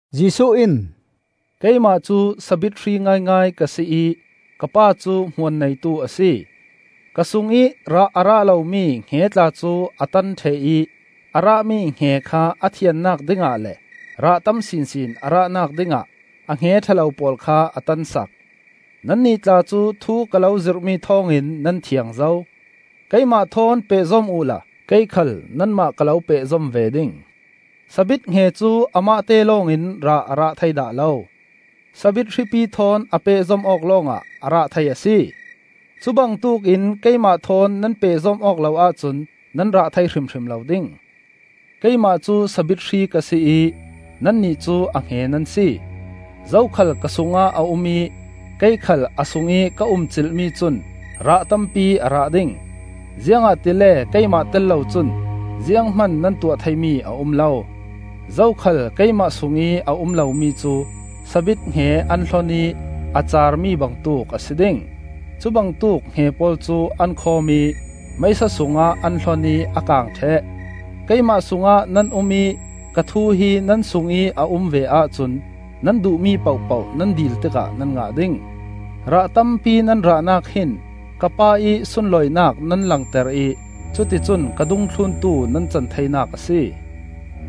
Jesuh in, “Keimah cu sabit hri ngaingai ka si ih ka Pa cu hmuan neitu a si. Ka sungih rah a rah lomi hnge tla cu a tan ṭheh ih a rahmi hnge kha a thiannak dingah le rah tam sinsin a rahnak dingah a hnge ṭha lo pawl kha a tansak. Nannih tla cu thu ka lo zirhmi thawngin nan thiang zo. Keimah thawn pehzom uhla kei khal nanmah ka lo pehzom ve ding. sabit hnge cu amahte lawngin rah a rah thei dah lo; sabit hripi thawn a pehzom awk lawngah a rah thei a si. Cubangtuk in keimah thawn nan pehzom awk lo ahcun nan rah thei hrimhrim lo ding. Keimah cu sabit hri ka si ih nannih cu a hnge nan si. Zokhal ka sungah a um ih kei khal a sungih ka umcilh mi cun rah tampi a rah ding; ziangahtile keimah tel lo cun zianghman nan tuah theimi a um lo. Zokhal keimah sungih a um lomi cu sabit hnge an hlon ih a carmi bangtuk a si ding. Cubangtuk hnge pawl cu an khawm ih meisa sungah an hlon ih a kang ṭheh. Keimah sungah nan um ih ka thu hi nan sungih a um ve ahcun nan duhmi pohpoh nan dil tikah nan ngah ding. Rah tampi nan rahnak hin ka Pa ih sunlawinak nan langter ih cuti cun ka dungthluntu nan can theinak a si.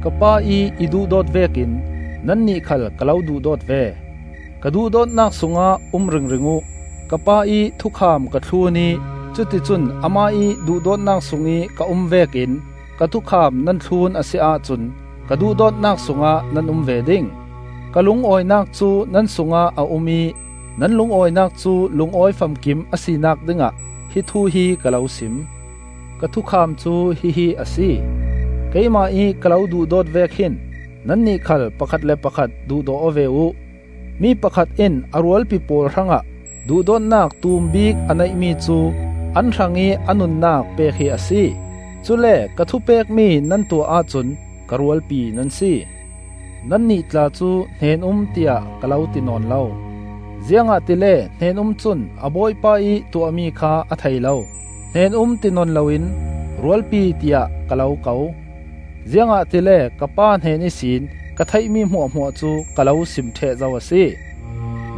Ka Pa ih i duhdawt vekin nannih khal ka lo duhdawt ve; ka duhdawtnak sungah um ringring uh. Ka Pa ih thukham ka thlun ih cuti cun amah ih duhdawtnak sungih ka um vekin ka thukham nan thlun a si ahcun ka duhdawtnak sungah nan um ve ding. Ka lungawinak cu nan sungah a um ih nan lungawinak cu lungawi famkim a sinak dingah hi thu hi ka lo sim. Ka thukham cu hihi a si: Keimah ih ka lo duhdawt vek hin nannih khal pakhat le pakhat duhdaw aw ve uh! Mi pakhat in a rualpi pawl hrangah duhdawtnak tum bik a neihmi cu an hrangih a nunnak pek hi a si. Cule ka thupekmi nan tuah ahcun ka rualpi nan si. Nannih tla cu hnen-um tiah ka lo ti nawn lo, ziangahtile hnen-um cun a bawipa ih tuahmi kha a thei lo. ‘Hnen-um,’ ti nawn loin ‘Rualpi,’ tiah ka lo ko: ziangahtile ka Pa hnen ihsin ka theihmi hmuahhmuah cu ka lo sim ṭheh zo a si.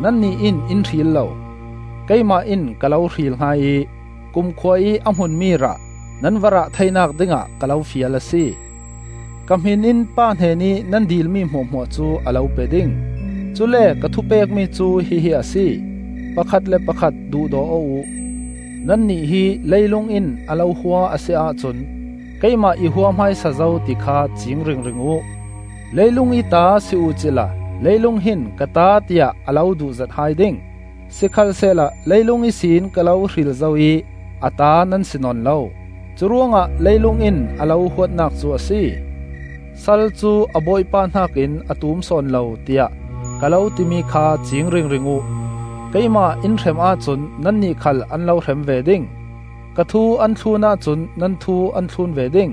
Nannih in in hril lo; keimah in ka lo hril hai ih kumkhua ih a hmunmi rah nan va rah theinak dingah ka lo fial a si. Ka hmin in Pa hnenih nan dilmi hmuahhmuah cu a lo pe ding. Cule ka thupekmi cu hihi a si: pakhat le pakhat duhdaw aw uh. Nannih hi leilung in a lo hua a si ahcun keimah i hua hmaisa zo ti kha cing ringring uh. Leilung ih ta si uh cila leilung hin ka ta tiah a lo duhzet hai ding. Sikhalsehla leilung ihsin ka lo hril zo ih a ta nan si nawn lo; curuangah leilung in a lo huatnak cu a si. ‘Sal cu a bawipa hnakin a tum sawn lo,’ tiah ka lo timi kha cing ringring uh. Keimah in hrem ahcun nannih khal an lo hrem ve ding; ka thu an thlun ahcun nan thu an thlun ve ding.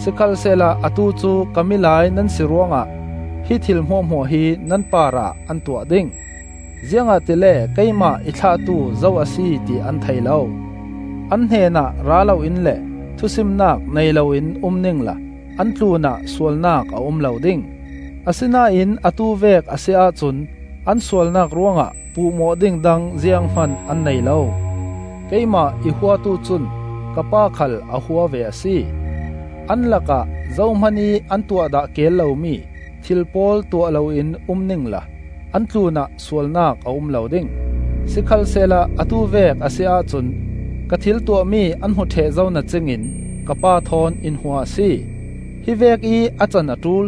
Sikhalsehla atu cu ka milai nan si ruangah hi thil hmuahhmuah hi nan parah an tuah ding. Ziangahtile keimah i thlahtu zo a si ti an thei lo. An hnenah ra loin le thusimnak nei loin um ningla an tlunah sualnak a um lo ding; asinain atu vek a si ahcun an sualnak ruangah puhmawh ding dang zianghman an nei lo. Keimah i huatu cun ka Pa khal a hua ve a si. An lakah zohmanih an tuah dah keel lomi thil pawl tuah loin um ningla an tlunah sualnak a um lo ding; sikhalsehla atu vek a si ahcun ka thil tuahmi an hmu ṭheh zo na cingin ka Pa thawn in hua a si. Hi vekih a can a ṭul,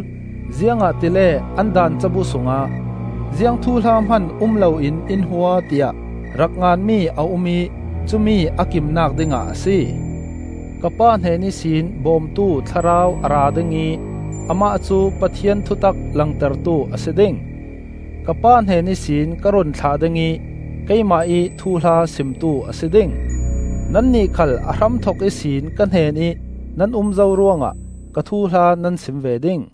ziangahtile an Daan cabu sungah ‘Ziang thuhla hman um loin in hua,’ tiah rak nganmi a um ih cumi a kimnak dingah a si. Ka Pa hnen ihsin Bawmtu Thlarau a ra ding ih amah cu Pathian thutak langtertu a si ding. Ka Pa hnen ihsin ka run thlah ding ih keimah ih thuhla simtu a si ding. Nannih khal a hramthok ihsin ka hnenih nan um zo ruangah ka thuhla nan sim ve ding.